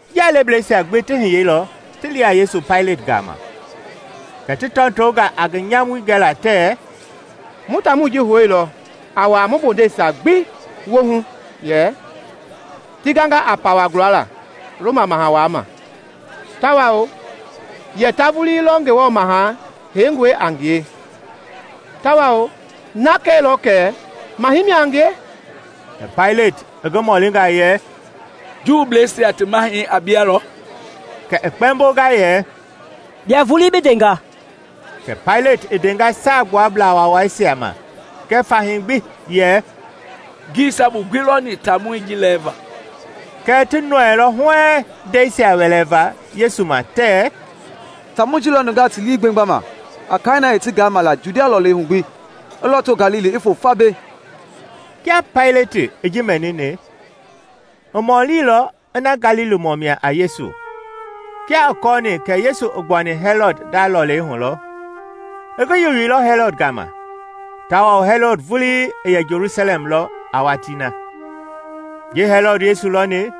Njialebleisia gbi ti hiyeilɔ ti li a Yesu Paileti gama. Kɛ ti tɔtonga a ngi nyamui gɛla tɛɛ, “Mu taamɔi ji houilɔ a wuaa mu bondeisia gbi woohu yɛ ti ganga a pawɛi gulala Roma Maha Wai ma, tawao yɛ ta vulii lɔ Ngewɔ Maha Heingɔi a ngie tawao na kɛilɔ kɛ maha mia a ngie.” Kɛ Paileti i ngi mɔlinga yɛ, “Juubleisia ti mahɛi a bia lɔ?” Kɛ i kpɛmbonga yɛ, “Bia vulii bi ndenga.” Kɛ Paileti i ndenga Saagbuablaa Waawaisia ma kɛɛ fahii gbi yɛ, “Ngii sabu gbi lɔni taamɔi ji lɛɛva.” Kɛɛ ti nɔɛilɔ huɛɛŋ ndɛisia wɛlɛvaa Yesu ma tɛɛ, “Taamɔi ji lɔ nungaa ti lii gbemgbama a kaai na i ti gaama la Judia lɔlei hu gbi, i lɔto Galili i foo fa mbei.” Kia Paileti i ji mɛnini, i mɔlilɔ ina Galilimɔ mia a Yesu. Kia i kɔɔni kɛ Yesu i gbuani Hɛlɔd nda lɔlei hu lɔ, i ngi yoyeilɔ Hɛlɔd gama, tawao Hɛlɔd vulii i yɛ Jelusalɛm lɔ a watii na. Ji Hɛlɔd Yesu lɔni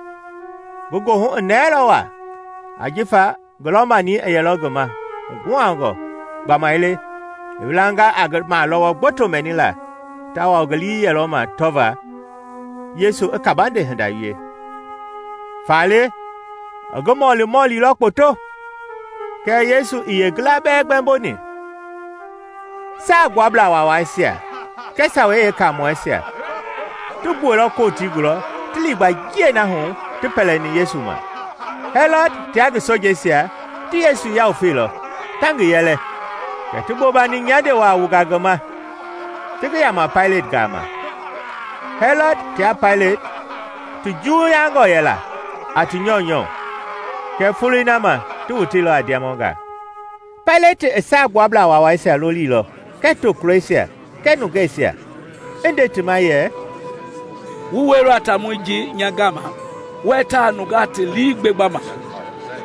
ngi goohu i nɛɛlɔ wa ajifa ngi lɔ-mani i yɛlɔ ngi ma huguhangɔ gbamaile i wilanga a ngi malɔwɔ gboto mɛnila tawao ngi lii yɛlɔ ma tɔvaa Yesu i kabande hinda wie. Faale i ngi mɔlimɔlilɔ kpoto, kɛɛ Yesu ii yeengila bɛɛ gbɛmboni. Saagbuablaa Waawaisia kɛɛ Sawei Yeekaamɔisia ti gbuɛilɔ Kotii gulɔ ti liigba njiɛi na hu ti pɛlɛni Yesu ma. Hɛlɔd tia ngi sojeisia ti Yesu yawufeilɔ, ta ngi yɛlɛ; kɛ ti bobani nyande wa wunga ngi ma, ti ngi yama Paileti gama. Hɛlɔd tia Paileti ti juwuyangɔ yɛla a ti nyɔunyɔ kɛɛ foloi na ma ti woteilɔ a ndiamɔngaa. Paileti i Saagbuablaa Waawaisia lolilɔ kɛɛ tokulɔisia kɛɛ nungeisia, i nde ti ma yɛ, “Wu wɛilɔ a taamɔi ji nya gama wɛɛ ta nungaa ti lii gbemgbama.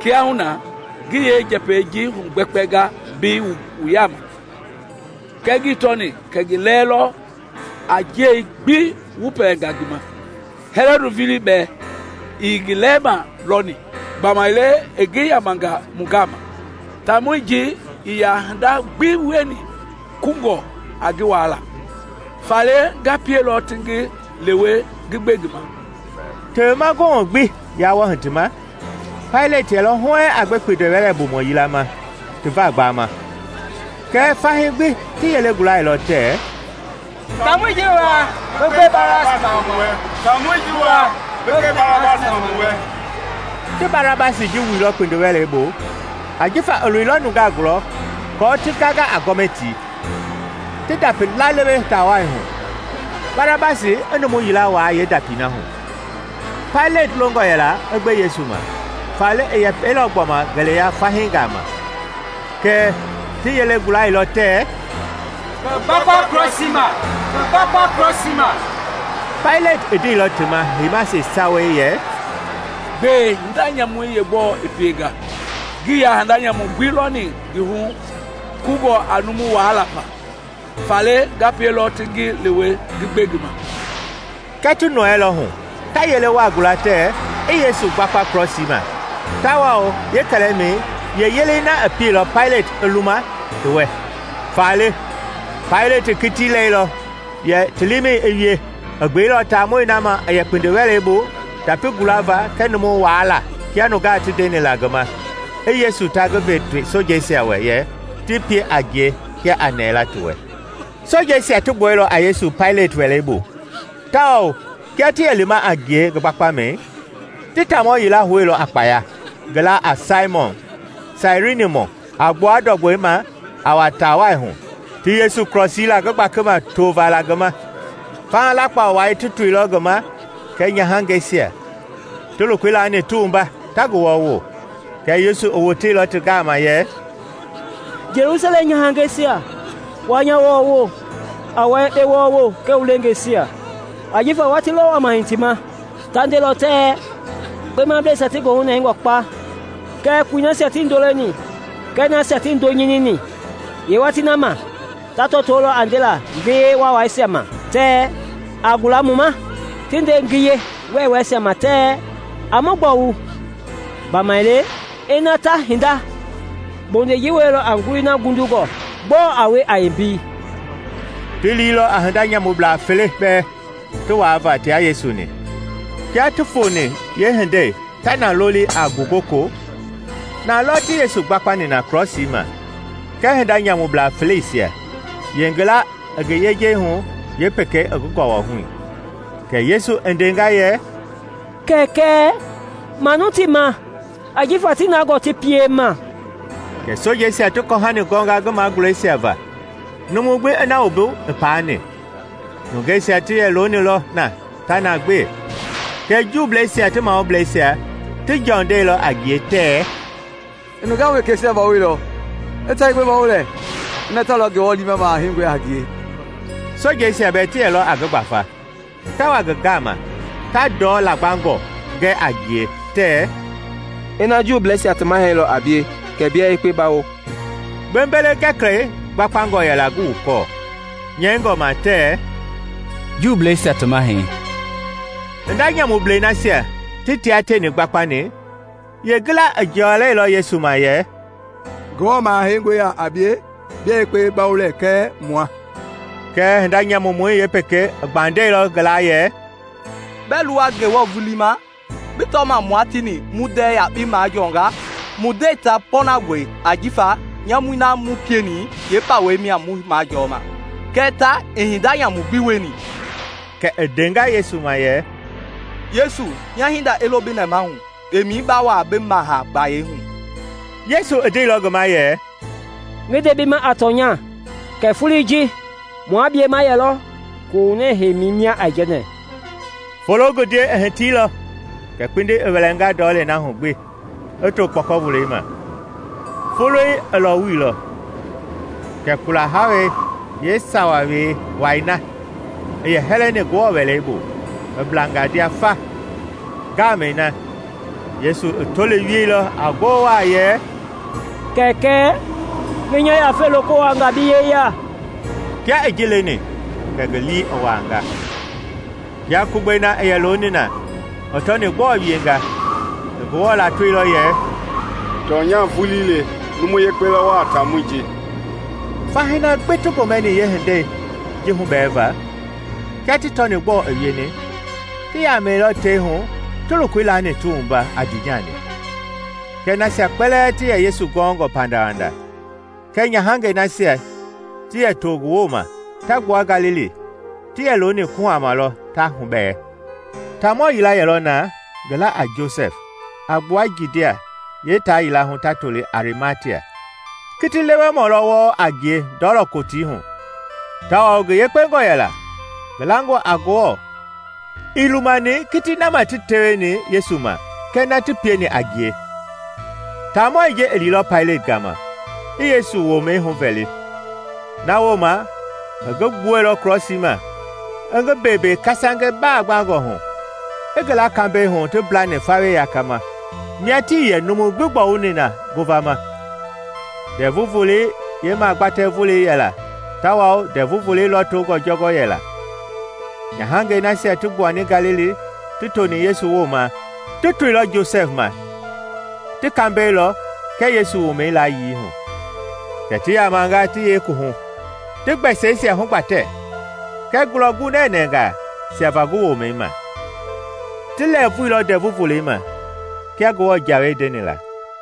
Kiahuna, ngi yeenjɛpɛi ji hugbɛkpɛnga mbei wu yaama kɛɛ ngii tɔni kɛ ngi lɛɛ lɔ a njiɛi gbi wu pɛlɛnga ngi ma. Hɛlɔd vulii bɛɛ ii ngi lɛɛma lɔni, gbamaile i ngi yamanga mu gama. Taamɔi ji ii ya hinda gbi wieni kungɔ a ngi waala. Faale nga pielɔ ti ngi lewe ngi gbe ngi ma.” [ Tewemahu Gomɛ gbi yaa wɔɔ hitima Paileti yɛlɔ huɛɛŋ a gbe kpindiwɛlɛbumɔ yila ma ti va gbama.] Kɛɛ fahii gbi ti yele gulailɔ tɛɛ, “Taamɔi ji waa, bi gbe Barabasi ma mu wɛ!” (Ti Barabasi ji wuilɔ kpindiwɛlei bu ajifa i loilɔ nungaa gulɔ kɔɔ ti ganga a gɔmɛtii, ti ndapi lalewe taa wai hu, Barabasi i numu yila waa yeendapii na hu.) Paileti longɔ yɛla i gbe Yesu ma, faale i yɛpɛilɔ gbɔma ngeleya fahii gama; kɛɛ ti yelei gulailɔ tɛɛ, “Ngi gbakpa krɔsii ma! Ngi gbakpa krɔsii ma!” Paileti i ndeilɔ ti ma heima yeesawei yɛ, “Gbɛe, hinda nyamui yeegbɔɔ i pienga? Ngii ya hinda nyamu gbi lɔni ngi hu kungɔ a numu walaa fa; faale nga pielɔ ti ngi lewe ngi gbe ngi ma.” Kɛɛ ti nɔɛilɔ hu, ta yele wa gula tɛɛ i Yesu gbakpa krɔsii ma tawao kɛlɛmɛi yeeyelei na i pieilɔ Paileti i luma ti wɛ. Faale Paileti i kiti lɛilɔ yɛ ti liimɛi i wie. I gbeilɔ taamɔi na ma i yɛ kpindiwɛlei bu ndapi Gulava kɛɛ numu walaa kia nungaa ti ndeni la ngi ma, i Yesu ta ngi ve ngi sojeisia wɛ yɛ ti pie a ngie kia a nɛɛla ti wɛ. Sojeisia ti gbuɛilɔ a Yesu Paileti wɛlei bu tawao kia ti yɛ lima a ngie ngi gbakpamɛi, ti taamɔ yila houilɔ a kpaya, ngi laa a Saimɔn, Sairinimɔi, a gbua ndɔgbɔi ma a wa taawai hu, ti Yesu krɔsii la ngi gbakima tovaa la ngi ma. Faha lakpa wa ti toilɔ ngi ma kɛɛ nyahangɛisia, ti lokoi laani ti wumba ta ngi wɔɔwo. Kɛɛ Yesu i woteilɔ ti gama yɛ, “Jelusalɛm nyahangɛisia! Wa nya wɔɔwo, a wua yekpe wɔɔwo kɛɛ wu leengeisia. Ajifa watii lɔ wama hitima ta ndelɔ tɛɛ, ‘Kpemableisia ti goohu nɛngɔ kpa kɛɛ koi nasia tii ndo leni kɛɛ nasia tii ndoo nyinini!’ Yeewatii na ma ta tɔtolɔ a ndela ngiye waawaisia ma tɛɛ, ‘A gula mu ma;’ ti nde ngiye wɛɛwɛɛisia ma tɛɛ, ‘A mu gbɔwu!’ Gbamaile ina ta hinda bondei ji wielɔ a ngulii na ngundungɔ, gbɔɔ a wie a yeembei?” Ti liilɔ a hinda nyamublaa fele bɛɛ ti waava tia Yesu-ni. Kia ti foni yeehindei, ta na loli a “Ngugoko”, na lɔ ti Yesu gbakpani na krɔsii ma kɛɛ hinda nyamublaa feleisia, yeengila i ngi yejei hu, yeepekei i ngi gɔwɔi hu. Kɛ Yesu i ndenga yɛ, “Kɛkɛ, manu ti ma; ajifa tii na gɔɔ ti piema.” Kɛ sojeisia ti kɔhani gɔnga ngi magulɛisia va, numu gbi i na wumbu i paani. Nungeisia ti yɛ loonilɔ na ta na gbe, kɛɛ Juubleisia ti mahubleisia ti jɔndɛilɔ a ngie tɛɛ, “I nungaa wekeisia bawoilɔ; i ta yekpe bawo lɛɛ, ina ta lɔ Ngewɔ liima maha Heingɔi a ngie!” Sojeisia bɛɛ ti yɛlɔ a ngi gbafa, ta wa ngi gama, ta ndɔ lagbangɔ gɛ a ngie, tɛɛ, “Ina Juubleisia ti mahɛi lɔ a bie kɛ bia yekpe bawo!” Gbembele-gɛkɛlɛi gbakpangɔ yɛla ngi wukɔɔ, nyɛingɔ ma tɛɛ, “Juubleisia ti Mahɛi” Hinda nyamublɛi nasia ti tia tieni gbakpani yeengila i jɔlɛilɔ Yesu ma yɛ, “Ngewɔ Maha Heingɔi ya a bie? Bia yekpe bawo lɛɛ kɛɛ mua!” Kɛɛ hinda nyamumɔi yeepekei i gbandɛilɔ ngi la yɛ, “Bɛɛ luwa Ngewɔ vulii ma, bi tɔma mua tieni mu ndɛɛ yakpei majɔnga? Mu ndɛi ta pɔɔnangɔe ajifa nyamui na mu pieni yeepawei mia mu majɔma; kɛɛ ta ii hinda nyamu gbi wieni.” Kɛ i ndenga Yesu ma yɛ, “Yesu, nya hinda i lo bi nɛmahu kpemɛi ba wua bi Maha gbayei hu.” Yesu i ndeilɔ ngi ma yɛ, “Ngi nde bi ma a tɔnya kɛ foloi ji mua bie ma yɛlɔ kohunɛ heimi mia aijɛnɛ.” Fologundiei i hitiilɔ kɛ kpindi i wɛlɛnga ndɔlei na hu gbi i to kpɔkɔvolei ma; foloi i lɔwuilɔ, kɛ kula hawei yeesawei wai na i yɛ hɛlɛni Ngewɔ Wɛlei bui i blanga ndia fa. Ngamɛi na, Yesu i toli wieilɔ a ngoo wa yɛ, “Kɛkɛ, ngi nya yafei loko wuaanga bi yeya!” Kia i ji leni kɛ ngi lii i wuanga. Kia Kugbei na i yɛ looni na i tɔni gbɔɔ wienga, i Ngewɔ latoilɔ yɛ, “Tɔnya vulii le, numu yekpe lɔ wɔɔ a taamɔi ji!” Fahii na gbi ti gomɛni yeehindei ji hubɛɛva, kia ti tɔni gbɔɔ i wieni, ti yamɛilɔ tei hu ti lokoi laani ti wumba a ndiinyani. Kɛɛ nasia kpɛlɛɛ ti yɛ Yesu gɔngɔ pandawanda kɛɛ nyahangɛi nasia ti yɛ to ngi wooma ta gbua Galili ti yɛ looni kuhama lɔ ta hubɛɛ. Taamɔ yila yɛlɔ na, ngi la a Josɛf, a gbua Judia yeetaa yila hu ta toli a Arimatia. Kiti-lewemɔ lɔ wɔɔ a ngie Ndɔlɔ Kotii hu tawao ngi yekpengɔ yela, ngi langɔ a Ngewɔ. Ii lumani kitii na ma ti teweni Yesu ma kɛɛ na ti pieni a ngie. Taamɔi ji i liilɔ Paileti gama i Yesu womɛi huvɛli. Na wooma i ngi gbuɛilɔ krɔsii ma, i ngi beembee kasange bagbangɔ hu, i ngi la kambɛi hu ti mblani fawei yakama, mia tii yɛ numu gbi gbɔwuni na ngovama. Ndɛvu Volei yeemagbatɛ volei yɛla tawao Ndɛvu Volei lɔtongɔ jɔngɔ yɛla. Nyahangɛi nasia ti gbuani Galili ti toni Yesu wooma ti toilɔ Josɛf ma ti kambɛi lɔ kɛɛ Yesu womɛi layii hu. Kɛ ti yamanga ti yee kuwuhu, ti gbɛsɛisia hugbatɛ kɛɛ ngulɔ gunɛnɛngaa siava ngi womɛi ma. Ti lɛɛvuilɔ Ndɛvu Volei ma kia Ngewɔ jawei ndeni la.